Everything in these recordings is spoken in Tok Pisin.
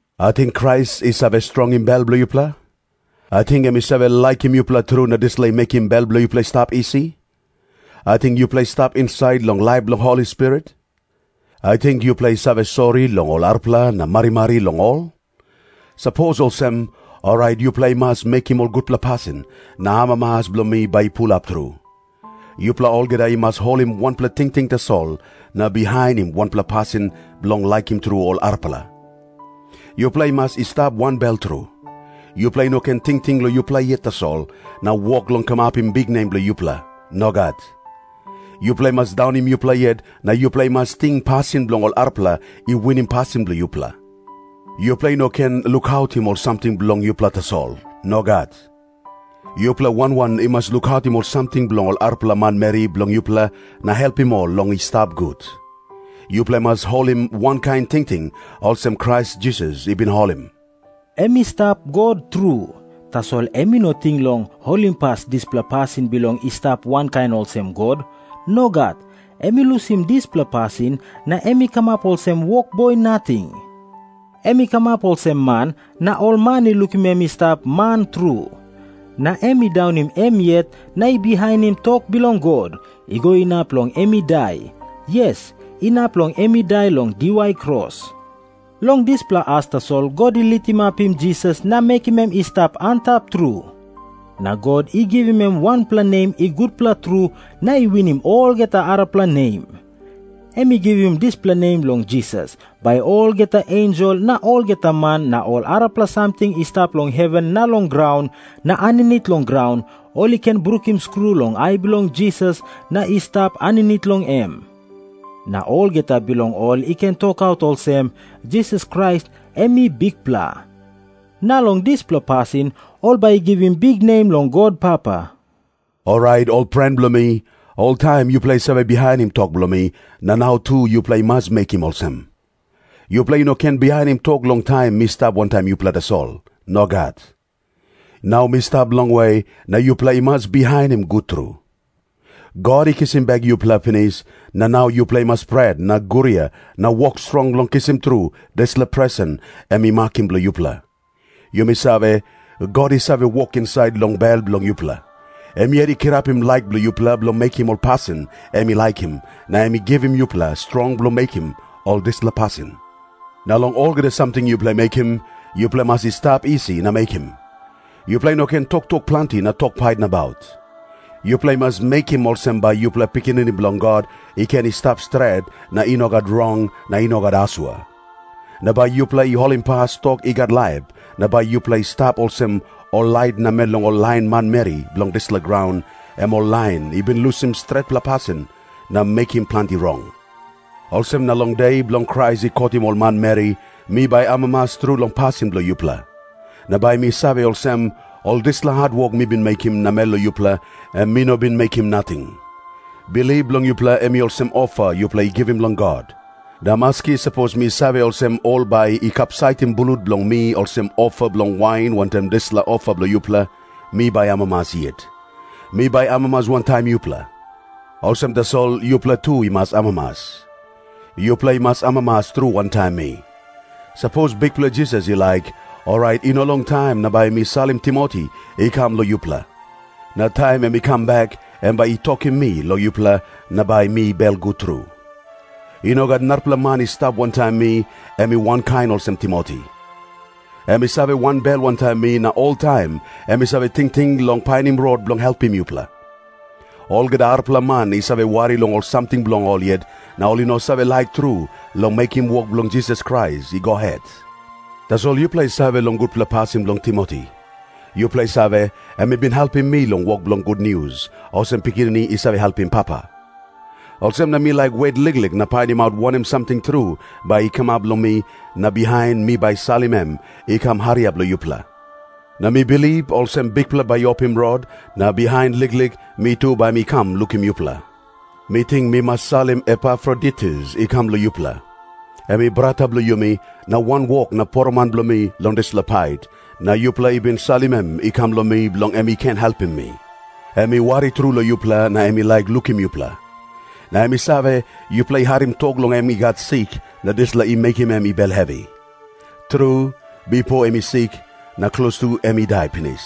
Ating Krais i save strongim bel bilong yupela? Ating em i save laikim yupela tru na dispela i mekim bel bilong yupela i stap isi? Ating yupela i stap insait long laip bilong Holi Spirit? Ating yupela i save sori long ol arapela na marimari long ol? Sapos olsem, orait yupela i mas mekim ol gutpela pasin, na amamas bilong mi bai i pulap tru. Yupela olgeta i mas holim wanpela tingting tasol, na bihainim wanpela pasin bilong laikim tru ol arapela. Yupela i mas i stap wanbel tru. Yupela i no ken tingting long yupela yet tasol, na wok long kamapim biknem bilong yupela. Nogat. Yupela i mas daunim yupela yet na yupela i mas ting pasin bilong ol arapela i winim pasin bilong yupela. Yupela i no ken lukautim ol samting bilong yupela tasol. Nogat. Yupela wan wan i mas lukautim ol samting bilong ol arapela manmeri bilong yupela na helpim ol long i stap gut. Yupela i mas holim wankain tingting olsem Krais Jisas i bin holim. Em i stap God tru, tasol em i no ting long holimpas dispela pasin bilong i stap wankain olsem God. Nogat. Em i lusim dispela pasin, na em i kamap olsem wokboi nating. Em i kamap olsem man na ol man i lukim em i stap man tru. Na em i daunim em yet na i bihainim tok bilong God, i go inap long em i dai, yes, inap long em i dai long diwai kros. Long dispela as tasol God i litimapim Jisas na mekim em i stap antap tru. Na God i givim em wanpela nem i gutpela tru na i winim olgeta arapela nem. Em i givim dispela nem long Jisas, bai olgeta ensel na olgeta man na ol arapela samting i stap long heven na long graun na aninit long graun ol i ken brukim skru long ai bilong Jisas na i stap aninit long em. Na olgeta bilong ol i ken tokaut olsem, “Jisas Krais em i Bikpela.” Na long dispela pasin ol bai i givim biknem long God Papa. Orait, ol pren bilong mi, oltaim yupela i save bihainim tok bilong mi, na nau tu yupela i mas mekim olsem. Yupela i no ken bihainim tok long taim mi stap wantaim yupela tasol. Nogat. Nau mi stap longwe, na yupela i mas bihainim gut tru. God i kisim bek yupela pinis, na nau yupela i mas pret na guria na wok strong long kisim tru dispela presen em i makim bilong yupela. Yumi save, God i save wok insait long bel bilong yupela. Em yet i kirapim laik bilong yupela bilong mekim ol pasin em i laikim, na em i givim yupela strong bilong mekim ol dispela pasin. Na long olgeta samting yupela i mekim, yupela i mas i stap isi na mekim. Yupela i no ken toktok planti na tok pait nabaut. Yupela i mas mekim olsem bai yupela pikinini bilong God i ken i stap stret na i no gat rong na i no gat asua. Na bai yupela i holimpas tok i gat laip, na bai yupela i stap olsem ol lait namel long ol lain manmeri bilong dispela graun, em ol lain i bin lusim stretpela pasin na mekim planti rong. Olsem na long De bilong Krais i kotim ol manmeri, mi bai amamas tru long pasin bilong yupela. Na bai mi save olsem, ol dispela hatwok mi bin mekim namel long yupela, em mi no bin mekim nating. Bilip bilong yupela em i olsem ofa yupela i givim long God. Na maski sapos mi save olsem ol bai i kapsaitim blut bilong mi olsem ofa bilong wain wantaim dispela ofa bilong yupela, mi bai amamas yet. Mi bai amamas wantaim yupela. Olsem tasol yupela tu i mas amamas. Yupela i mas amamas tru wantaim mi. Sapos Bikpela Jisas i laik, orait i no longtaim na bai mi salim Timoti i kam long yupela. Na taim em i kam bek, em bai i tokim mi long yupela, na bai mi belgut tru. I no gat narapela man i stap wantaim mi em i wankain olsem Timoti. Em i save wanbel wantaim mi na oltaim em i save tingting long painim rot bilong helpim yupela. Olgeta arapela man i save wari long ol samting bilong ol yet, na ol i no save laik tru long mekim wok bilong Jisas Krais i go het. Tasol yupela i save long gutpela pasin bilong Timoti. Yupela i save, em i bin helpim mi long wok bilong gutnius, olsem pikinini i save helpim papa. Olsem na mi laik wet liklik na painimaut wanem samting tru bai i kamap long mi, na bihain mi bai salim em i kam hariap long yupela. Na mi bilip olsem Bikpela bai i opim rot, na bihain liklik mi tu bai mi kam lukim yupela. Mi ting mi mas salim Epafroditus i kam long yupela. Em i brata bilong yumi, na wanwok na poroman bilong mi long dispela pait, na yupela i bin salim em i kam long mi bilong em i ken helpim mi. Em i wari tru long yupela na em i laik lukim yupela. Na em i save, yupela i harim tok long em i gat sik, na dispela i mekim em i bel hevi. Tru, bipo em i sik, na klostu em i dai pinis.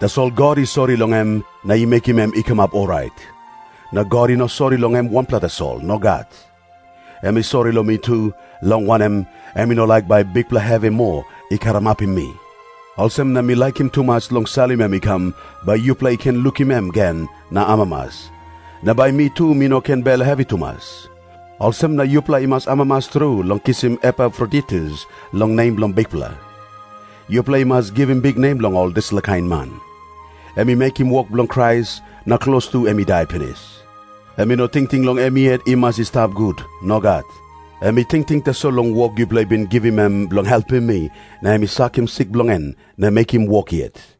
Tasol God i sori long em na i mekim em i kamap orait. Na God i no sori long em wanpela tasol. Nogat. Em i sori long mi tu, long wanem, em i no laik bai bikpela hevi moa i karamapim mi. Olsem na mi laikim tumas long salim em i kam, bai yupela i ken lukim em gen na amamas. Na bai mi tu mi no ken bel hevi tumas. Olsem na yupela i mas amamas tru long kisim Epafroditus long nem bilong Bikpela. Yupela i mas givim biknem long ol dispela kain man. Em i mekim wok bilong Krais na klostu em i dai pinis. Em i no tingting long em yet i mas i stap gut. Nogat. Em i tingting tasol long wok yupela i bin givim em bilong helpim mi, na em i sakim sik bilong en na mekim wok yet.